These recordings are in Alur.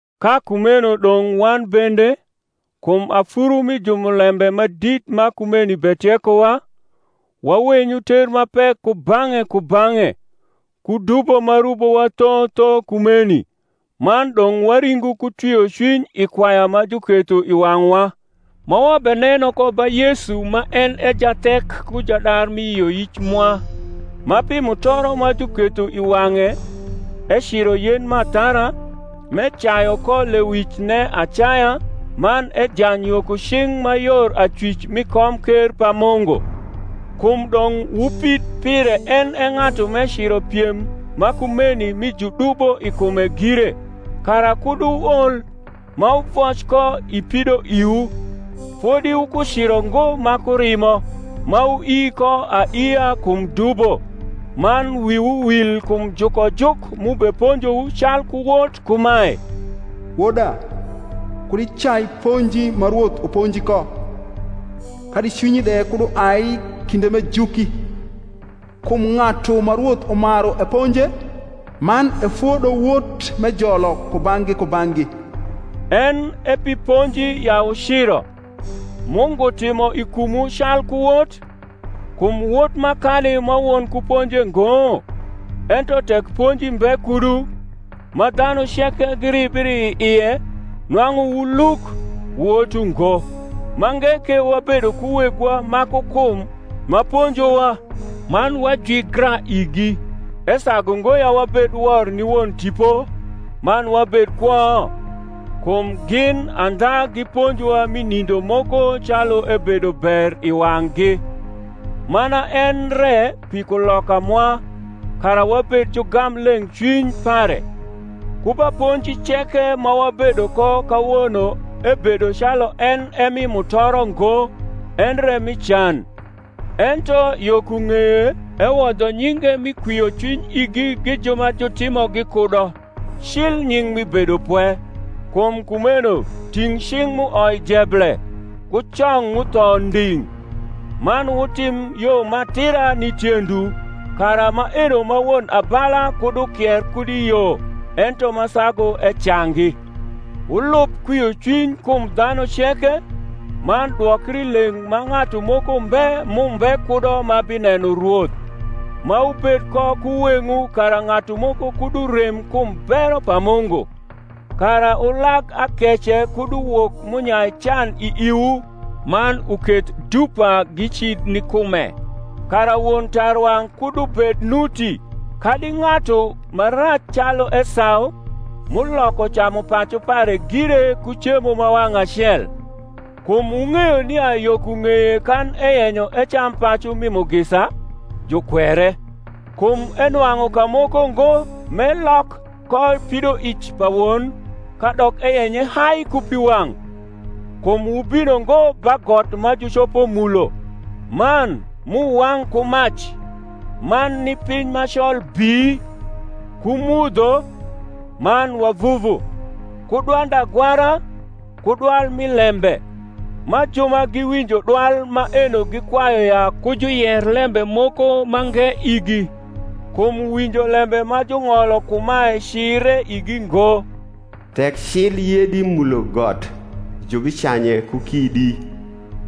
Ka kumeno dong’ wan bende, kum afuru mi jumulembe ma dit ma kumeni betiekowa, wawenyu ter ma pek kubang’e kubang’e, ku dubo ma rubowa tho tho kumeni, man dong’ waringu ku rwiocwiny i kwaya ma juketho i wang’wa, ma wabeneno ko ba Yesu ma en e jathek ku jadar rni yioyic mwa, ma pi mutoro ma juketho i wang’e eciro yen m’athara, m’ecayu ko lewicne acaya man ejany yo ku cing’ ma yor acwic rni komker pa Mungu. Kum dong’ wupid pire en e ng’atu m’eciro piem ma kumeni mi judubo i kume gire, kara kud wuol, ma wuvoc ko i pidoiwu. Fodi wukuciro ngo ma ku rimo, ma wuii ko aiia kum dubo: man wiwu wil kum jukojuk m’ubeponjowu calku wot kumae, Woda, kud icai ponji ma Rwoth uponji ko, Kadi cwinyi kud uai kinde m’ejuki; Kum ng’atu ma Rwoth umaru eponje, Man efodo wot m’ejolo kubang’gi kubang’gi. En e pi ponji ya wuciro: Mungu timo i kumwu calku wot; kum wot makani ma won kuponje ngo? Ento tek ponji mbe kudu, ma dhanu ceke giribri i ie, nwang’u wu luk, wot ungo. Mange ke wabedo ku wegwa ma ku kum ma ponjowa, man wajwigra igi: esagu ngo ya wabed wor ni Won tipo, man wabed kwo? Kum gin andha giponjowa rni nindo moko calu ebedo ber i wang’gi; mana en re pi kuloka mwa, kara wabed jugam leng’cwiny pare. Ku ba ponji ceke ma wabedo ko kawono ebedo calu en e mi mutoro ngo endre mi can; ento yo ku ng’eye ewodho nyinge mi kwiocwiny igi gi ju ma jutimogi kudo, cil nying’ mi bedopwe. Kum kumeno ting’ cing’ m’uoi jeble, ku cong m’utho nding’; man wutim yo ma atira ni tiendwu, kara maeno ma won abala kud ukier kud i yo, ento ma sagu ecangi. Wniub kwiocwiny kum dhanu ceke, man dwokrileng’ ma ng’atu moko mbe m’umbe kudo ma bineno Rwoth: ma wubed ko ku weng’wu kara ng’atu moko kud urem kum bero pa Mungu; kara ulag akece kud uwok m’unyai can i iwu, man uketh dupa gicid ni kume; kara won tarwang’ kud ubed nuti, kadi ng’atu ma rac caiu Esau, m’uioko camupacu pare gire ku cemo ma wang’ acel. Kum wung’eyo nia yo ku ng’eye kan eyenyo ecam pacu mi mugisa, jukwere; kum enwang’u kamoko ngo m’elok ko pidoic pa won, kadok eyenye hai ku piwang’. Kum wubino ngo ba got ma jucopo mulo, man m’uwang’ ku mac, man ni piny ma col bii, ku mudho, man wavuvu, ku dwand agwara, ku dwal mi lembe; ma ju ma giwinjo dwal maeno gikwayu ya ku juyer lembe moko mange igi; kum winjo lembe ma jung’olo kumae cire igi ngo, Tek cil yedi mulo got, jubicanye ku kidi;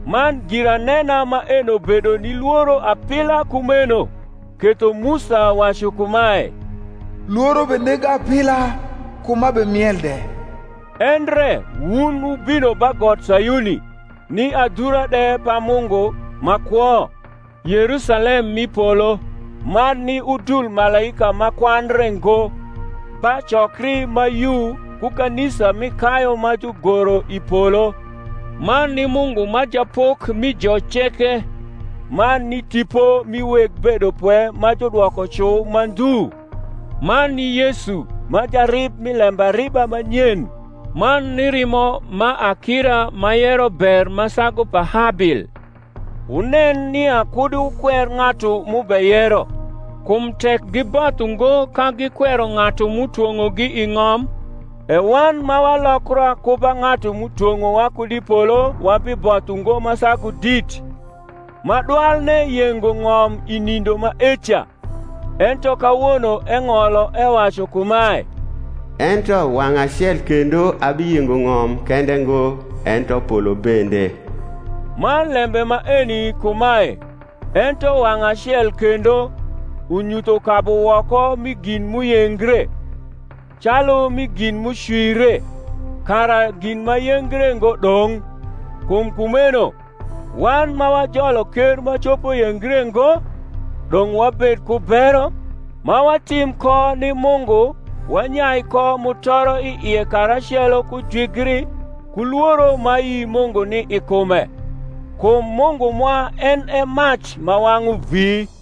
man giranena maeno bedo ni lworo apila kumeno, ketho Musa wacu kumae, Lworo benega apila kuma bemiel de: endre wun wubino ba got Sayuni, ni adhura de pa Mungu ma kwo, Yerusalem m’i polo, man ni udul malaika ma kwandre ngo, ba cokri ma yu ku kanisa mi kayu ma jugoro i polo, man ni Mungu ma Japok mi jo ceke, man ni tipo mi weg bedopwe ma judwoko cu ma ndhu, man ni Yesu ma jarib mi lembariba ma nyen, man ni rimo ma akira ma yero ber ma sagu pa Habil. Wunen nia kud wukwer ng’atu m’ubeyero. Kum tek giboth ungo ka gikwero ng’atu m’utwong’ogi i ng’om, e wan ma walokra ku ba ng’atu m’utwong’owa kud i polo wabiboth ungo ma sagu dit: ma dwalne yengo ng’om i nindo maeca: ento kawono eng’olo ewacu kumae, Ento wang’ acel kendo abiyengo ng’om kende ngo, ento polo bende. Man lembe maeni kumae, Ento wang’ acel kendo, unyutho kabuwoko mi gin m’uyengre, calu mi gin m’ucwire, kara gin ma yengre ngo dong’. Kum kumeno, wan ma wajolo ker ma copo yengre ngo, dong’ wabed ku bero, ma watim ko ni Mungu wanyai ko mutoro i ie karacelo ku jwigri ku lworo ma ayi Mungu ni i kume: kum Mungu mwa en e mac ma wang’u vi.